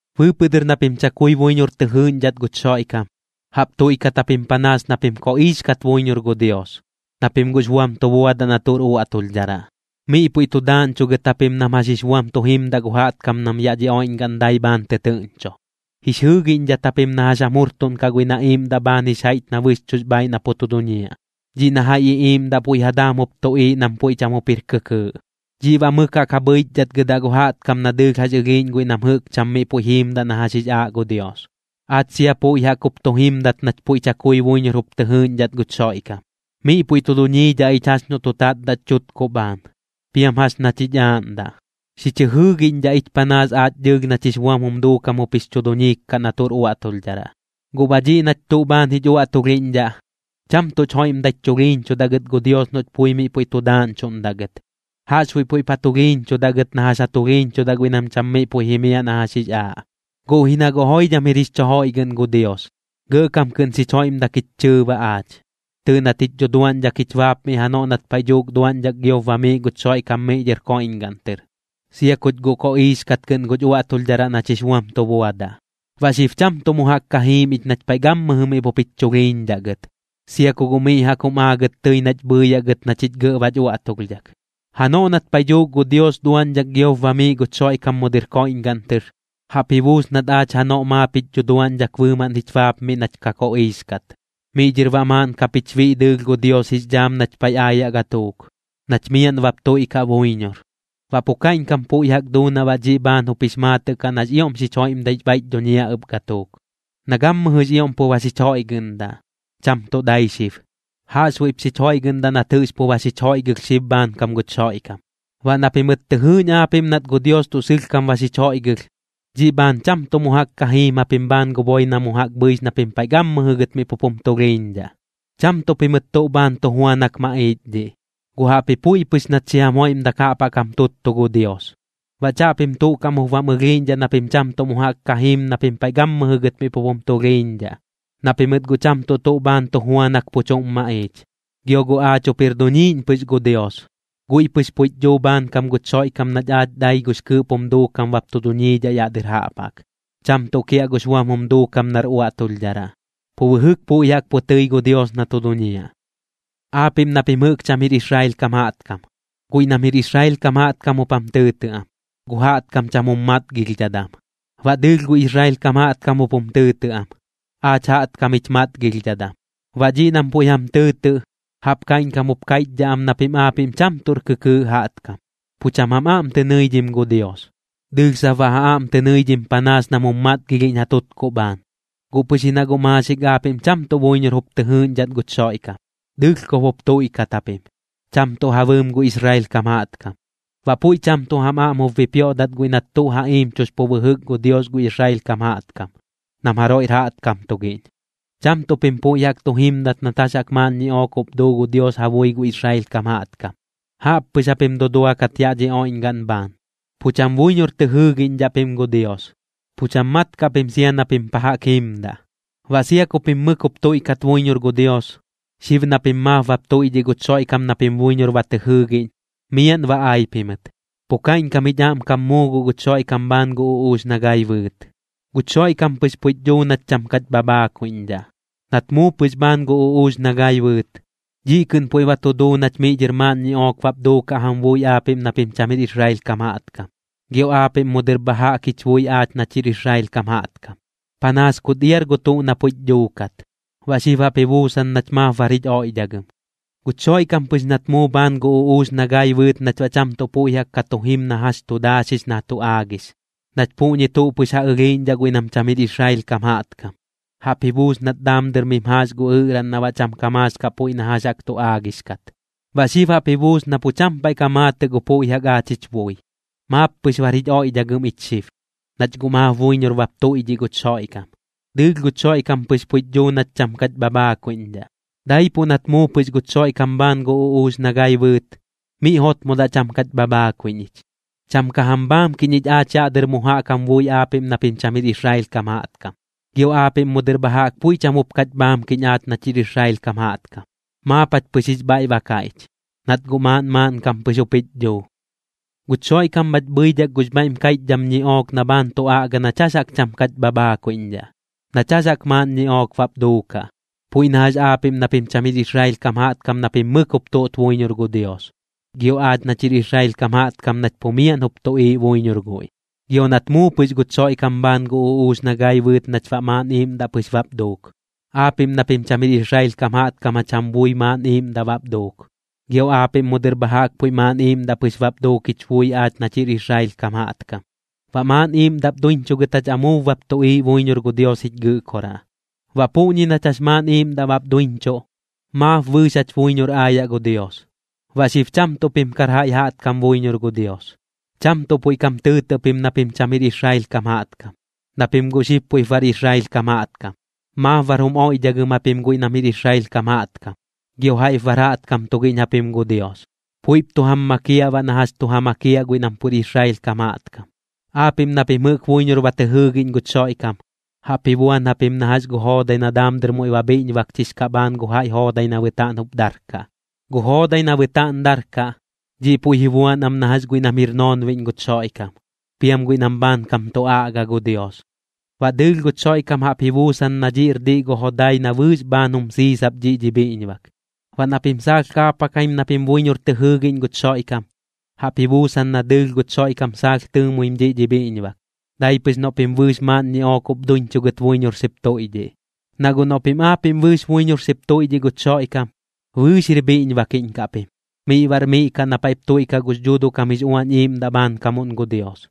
Bɨɨpɨꞌ dɨr na pim chakui buiñor tɨ jɨɨꞌñdhat guch Xoiꞌkam, jaꞌp tuiꞌkat japim panaas na pim koꞌiix kat buiñor gu Dios, na pim guꞌx buam tu buadaꞌ na tuꞌr uaꞌtulhdharaꞌ. Miꞌ puiꞌ tu daaꞌñchugɨt japim nam jax jix buam tu jimdaꞌ gu jaꞌtkam nam yaꞌ dhi oiꞌñgaꞌn dai bhaan tɨtɨɨꞌñcho, jix jɨɨgiꞌñdhat japim na jax jam jurtuꞌnkaꞌ guiꞌ na iiꞌmdaꞌ bhaan jix jaiꞌch na bɨxchuꞌx bhaaiꞌ na pu tu duñiaꞌ, dhiꞌ na jaiꞌ iꞌiiꞌmdaꞌ puiꞌ ja daam jup tuꞌiiꞌ nam puiꞌ cham jup jir kɨkɨɨꞌ. Dhiꞌ baꞌ mɨk jaꞌk ja bhɨichdhatgɨdaꞌ gu jaꞌtkam na dɨɨlh jax ɨlhiiꞌñ guiꞌ nam jɨꞌk cham miꞌ puiꞌ jiimdaꞌ na jax jix aaꞌ gu Dios. Aach sia puiꞌ jaꞌk jup tu jimdat nach puiꞌ chakui buiñor jup tɨ jɨɨꞌñdhat guch Xoiꞌkam, miꞌ puiꞌ tu duñiidhaꞌ ich jax noꞌ tu tatdaꞌch chutkuꞌ bhaan, piam jax nach jich aaꞌndaꞌ, xich jɨjɨɨgiꞌñdhaꞌ ich panaas aach dɨɨlh nach jix buam jum duukam jup jix chu duñiik kaꞌ na tuꞌr uaꞌtulhdharaꞌ. Guꞌ baꞌ dhiꞌ nach tuꞌ bhaan jich uaꞌtulhiꞌñdhaꞌ, cham tuꞌch joiꞌmdaich chulhiiñchudaꞌ gɨt gu Dios noꞌch pui miꞌ puiꞌ tu daaꞌñchuꞌndaꞌ gɨt, jaꞌxbuiꞌ puiꞌp jich chulhiiñchudaꞌ gɨt na jax ja tulhiiñchudaꞌ guiꞌ nam cham miꞌ puiꞌ jimiaꞌ na jax jix aaꞌ. Guꞌ ji na guꞌ joidham jir jix chu joiꞌgɨꞌn gu Dios, gɇꞌkam kɨꞌn xich joiꞌmdak jich chɨɨ baꞌ aach. Tɨɨꞌ nat jich dhuduaꞌñdhak jich baapmiꞌ janoꞌ nat paiꞌ dhuuk duaꞌñdhak giop bamiiꞌ guch Xoiꞌkam miꞌ dhɨr koiꞌñgaꞌn tɨr, sia kuch guꞌ koꞌiix kat kɨꞌn guch uꞌuaꞌtulhdharaꞌ nach jix buam tu buadaꞌ. Baꞌ xib cham tuꞌ mu jaꞌk ka jiim ich nach paiꞌ gammɨjɨ miꞌ pup jich chulhiiñdhaꞌ gɨt, sia ku guꞌ miꞌ jaꞌk jum aagɨt tɨi nach bhɨɨyaꞌ gɨt na chich gɇꞌ bach uaꞌtulhdhak. Janoꞌ nat paiꞌ dhuuk gu Dios duaꞌñdhak giop bamiiꞌ guch Xoiꞌkam mu dɨr koiꞌñgaꞌn tɨr, jaꞌp ji buus nat aach janoꞌ maap jich dhuduaꞌñdhak bɨɨmaꞌn jich baapmiꞌ nach ka koꞌiix kat. Miꞌ dhɨr baꞌ maaꞌn kap jich biꞌ dɨɨlh gu Dios jix dhaam nach paiꞌ aayaꞌ gatuuk, nach miaꞌn bap tuiꞌkaꞌ buiñor. Baꞌ pu kaiꞌñkam puiꞌ jaꞌk duu na baꞌ dhiꞌ bhaan jup jix maatɨꞌ kaꞌ nax ioꞌm xich joiꞌmdaix bhaiꞌch dhuñiaꞌ ɨp gatuuk, na gammɨjɨx ioꞌm pu ba xich joiꞌgɨꞌndaꞌ, cham tuꞌ dai xib. Jaꞌxbuiꞌp xich joiꞌgɨꞌndaꞌ nat jɨꞌx pu ba xich joiꞌgɨlh xib bhaankam guch Xoiꞌkam. Baꞌ na pimɨt tɨ jɨɨꞌñ aapiꞌm nat gu Dios tuꞌ sɨlhkam ba xich joiꞌgɨlh, dhiꞌ bhaan cham tuꞌ mu jaꞌk ka jiim japim bhaan gu boi na mu jaꞌk bhɨix na pim paiꞌ gammɨjɨ gɨt miꞌ pup jum tulhiiñdhaꞌ. Cham tuꞌ pimɨt tuꞌ bhaan tu juanak maꞌiich dhiꞌ, guꞌ jaꞌpji puiꞌ pɨx nat xi jam joiꞌmdak jaꞌp jaꞌk jam tuttu gu Dios. Baꞌ chaꞌpim tuꞌ kaꞌm jup bam ɨlhiiꞌñdhaꞌ na pim cham tuꞌ mu jaꞌk ka jiim na pim paiꞌ gammɨjɨ gɨt miꞌ pup jum tulhiiñdhaꞌ, na pimɨt guꞌ cham tuꞌ tuꞌ bhaan tu juanak pu chuꞌm maꞌiich. Gio guꞌ aach jup jir duniiꞌñ pɨx gu Dios, guiꞌ pɨx puiꞌch dhuu bhaankam guch Xoiꞌkam nach aach dai gux kɨɨꞌp jum duukam bap tu duñiidhaꞌ yaꞌ dɨr jaꞌp jaꞌk, cham tuꞌ kiaꞌ gux buam jum duukam nar uaꞌtulhdharaꞌ. Pu bɨjɨk puiꞌ jaꞌk pu tɨi guꞌ gu Dios na tu duñiaꞌ. Aapiꞌm na pim jɨꞌk cham jir Israel kam jaꞌtkam, guiꞌ nam jir Israel kam jaꞌtkam jup jam tɨɨtɨꞌ am: Gu jaꞌtkam cham jum matgilhdhadam. Baꞌ dɨɨlh gu Israel kam jaꞌtkam jup jum tɨɨtɨꞌ am: Aach jaꞌtkam jich matgilhdhadam. Baꞌ dhiꞌ nam puiꞌ jam tɨɨtɨꞌ, jaꞌp kaiꞌñkam jup kaiꞌchdhaꞌ am na pim aapiꞌm cham tuꞌr kɨkɨɨꞌ jaꞌtkam, pu cham jam aꞌm tɨ nɨidhim gu Dios. Dɨɨlh sap baꞌ ja aꞌm tɨ nɨidhim panaas nam jum matgilhiꞌñ ja tutkuꞌ bhaan. Guꞌ pɨx ji na guꞌ maaxik aapiꞌm cham tuꞌ buiñor jup tɨ jɨɨꞌñdhat guch Xoiꞌkam, dɨlhkob jup tuiꞌkat japim, cham tuꞌ ja bɨɨm gu Israel kam jaꞌtkam. Baꞌ puiꞌ cham tuꞌ jam aꞌm jup bipioꞌdat guiꞌ nat tuꞌ ja iimchux pu bɨjɨk gu Dios gu Israel kam jaꞌtkam, nam jaroiꞌr jaꞌtkam tugiꞌñ. Cham tuꞌ pim puiꞌ jaꞌk tu jimdat nat jax jaꞌk maaꞌn ñiꞌook jup duu gu Dios ja bui gu Israel kam jaꞌtkam, jaꞌp pɨx japim duduakat yaꞌ dhi oiꞌñgaꞌn bhaan. Pu cham buiñor tɨ jɨɨgiꞌñdhaꞌ pim gu Dios, pu cham mat kaꞌ pim sia na pim pa jaꞌk jiimdaꞌ. Baꞌ sia ku pim mɨk jup tuiꞌkat buiñor gu Dios, xib na pim maap bap tuiꞌdhiꞌ guch Xoiꞌkam na pim buiñor ba tɨ jɨɨgiꞌñ, miaꞌn ba ai pimɨt, pu kaiꞌñkam jich aꞌmkam muu guꞌ guch Xoiꞌkam bhaan gu uꞌuux na gai bɨɨt. Guch Xoiꞌkam pɨx puiꞌch dhuu nach cham kach bhabhaakuiꞌñdhaꞌ. Nat muu pɨx bhaan gu uꞌuux na gai bɨɨt, dhiꞌ kɨꞌn puiꞌ ba tu duu nach miꞌ dhɨr maaꞌn ñiꞌook bap duukaꞌ jam bui aapiꞌm na pim cham jir Israel kam jaꞌtkam, gio aapiꞌm mu dɨr bha jaꞌk jich bui aach nach jir Israel kam jaꞌtkam. Panaas kut iar gu tuꞌ na puiꞌch dhuukat, baꞌ xib jaꞌp ji buusan nach maap bar jich oiꞌdhagɨm. Guch Xoiꞌkam pɨx nat muu bhaan gu uꞌuux na gai bɨɨt nach baꞌ cham tuꞌ puiꞌ jaꞌk ka tu jim na jax tu daaxix na tu aagix, nach puꞌñi tuꞌ pɨx ja ɨlhiiꞌñdhaꞌ guiꞌ nam cham jir Israel kam jaꞌtkam, jaꞌp ji buus nat daam dɨr mim jaax gu ɨꞌraꞌn na baꞌ cham ka maax kaꞌ puiꞌ na jax jaꞌk tu aagix kat. Baꞌ xib jaꞌp ji buusan na pu cham paiꞌ ka maatɨꞌ gu puiꞌ jaꞌk aach jich bui, maap pɨx bar jich oiꞌdhagɨm ich xib, nach guꞌ maap buiñor bap tuiꞌdhiꞌ guch Xoiꞌkam. Dɨɨlh guch Xoiꞌkam pɨx puiꞌch dhuu nach cham kach bhabhaakuiꞌñdhaꞌ. Daipuꞌ nat muu pɨx guch Xoiꞌkam bhaan gu uꞌuux na gai bɨɨt, miꞌ jotmodaꞌ cham kach bhabhaakuiꞌñ ich. Cham ka jam bhaamkiꞌñ ich aach yaꞌ dɨr mu jaꞌk jam bui aapiꞌm na pim cham jir Israel kam jaꞌtkam, gio aapiꞌm mu dɨr bha jaꞌk puiꞌ cham jup kach bhaamkiꞌñ aach nach jir Israel kam jaꞌtkam. Maap jach pɨx jix bhaiꞌ ba kaiꞌch, nat guꞌ maaꞌn maaꞌnkam pɨx jup jich dhuu. Guch Xoiꞌkam bhach bhɨidhak gux bhaiꞌm kaiꞌchdham ñiꞌook na bhaan tu aꞌga nach jax jaꞌk cham kach bhabhaakuiꞌñdhaꞌ, nach jax jaꞌk maaꞌn ñiꞌook bap duukaꞌ, puiꞌ na jax aapiꞌm na pim cham jir Israel kam jaꞌtkam na pim mɨk jup tuꞌt buiñor gu Dios, gio aach nach jir Israel kam jaꞌtkam nach pu miaꞌn jup tuꞌiiꞌ buiñor guiꞌ. Gio nat muu pɨx guch Xoiꞌkam bhaan gu uꞌuux na gai bɨɨt nach baꞌ maaꞌn iiꞌmdaꞌ pɨx bap duuk. Aapiꞌm na pim cham jir Israel kam jaꞌtkam jach jam bui maaꞌn iiꞌmdaꞌ bap duuk, gio aapiꞌm mu dɨr bha jaꞌk puiꞌ maaꞌn iiꞌmdaꞌ pɨx bap duuk jich bui aach nach jir Israel kam jaꞌtkam. Baꞌ maaꞌn iiꞌmdaꞌp duiñchugɨt jach amuub bap tuꞌiiꞌ buiñor gu Dios jich Gɨꞌkoraꞌ. Baꞌ puꞌñi nach jax maaꞌn iiꞌmdaꞌ bap duiñchuꞌ, maap bɨɨx jach buiñor aayaꞌ gu Dios. Baꞌ xib cham tuꞌ pim kar jaiꞌ jaꞌtkam buiñor gu Dios, cham tuꞌ puiꞌ kam tɨɨtɨꞌ pim na pim cham jir Israel kam jaꞌtkam, na pim guꞌ xib puiꞌp bar Israel kam jaꞌtkam, maap bar jum oiꞌdhagɨm japim guiꞌ nam jir Israel kam jaꞌtkam. Gio jaiꞌp bar jaꞌtkam tugiꞌñ japim gu Dios, puiꞌp tu jam makiaꞌ baꞌ na jax tu ja makiaꞌ guiꞌ nam pur Israel kam jaꞌtkam. Aapiꞌm na pim jɨꞌk buiñor ba tɨ jɨɨgiꞌñ guch Xoiꞌkam, jaꞌp ji buan japim na jax gu joodai na daam dɨr muiꞌ ba bhiꞌñbakchix kaꞌ bhaan gu jaiꞌ joodai na bɨtaaꞌn jup darkaꞌ. Gu joodai na bɨtaaꞌn darkaꞌ, dhiꞌ puiꞌ ji buan am na jax guiꞌ nam jɨꞌk jir noonbiꞌñ guch Xoiꞌkam, piam guiꞌ nam bhaankam tu aꞌga gu Dios. Baꞌ dɨɨlh guch Xoiꞌkam jaꞌp ji buusan na dhiꞌr diꞌ gu jodai na bɨɨx bhaan jum siisap dhiꞌ dhi bhiꞌñbak. Baꞌ na pim saalh kaapakaim na pim buiñor tɨ jɨɨgiꞌñ guch Xoiꞌkam, jaꞌp ji buusan na dɨɨlh guch Xoiꞌkam saalh tɨɨmuim dhiꞌ dhi bhiꞌñbak, dai pɨx noꞌ pim bɨɨx maaꞌn ñiꞌook jup duiñchugɨt buiñor xip tuiꞌdhiꞌ. Na guꞌ noꞌ pim aapiꞌm bɨɨx buiñor xip tuiꞌdhiꞌ guch Xoiꞌkam, bɨɨx jir bhiꞌñbakiꞌñ kaꞌ pim, miꞌ baꞌr miꞌ kaꞌ na paiꞌp tuiꞌkaꞌ gux Dhuuduꞌ kam jix Uañ Iiꞌmdaꞌ bhaamkamuꞌn gu Dios.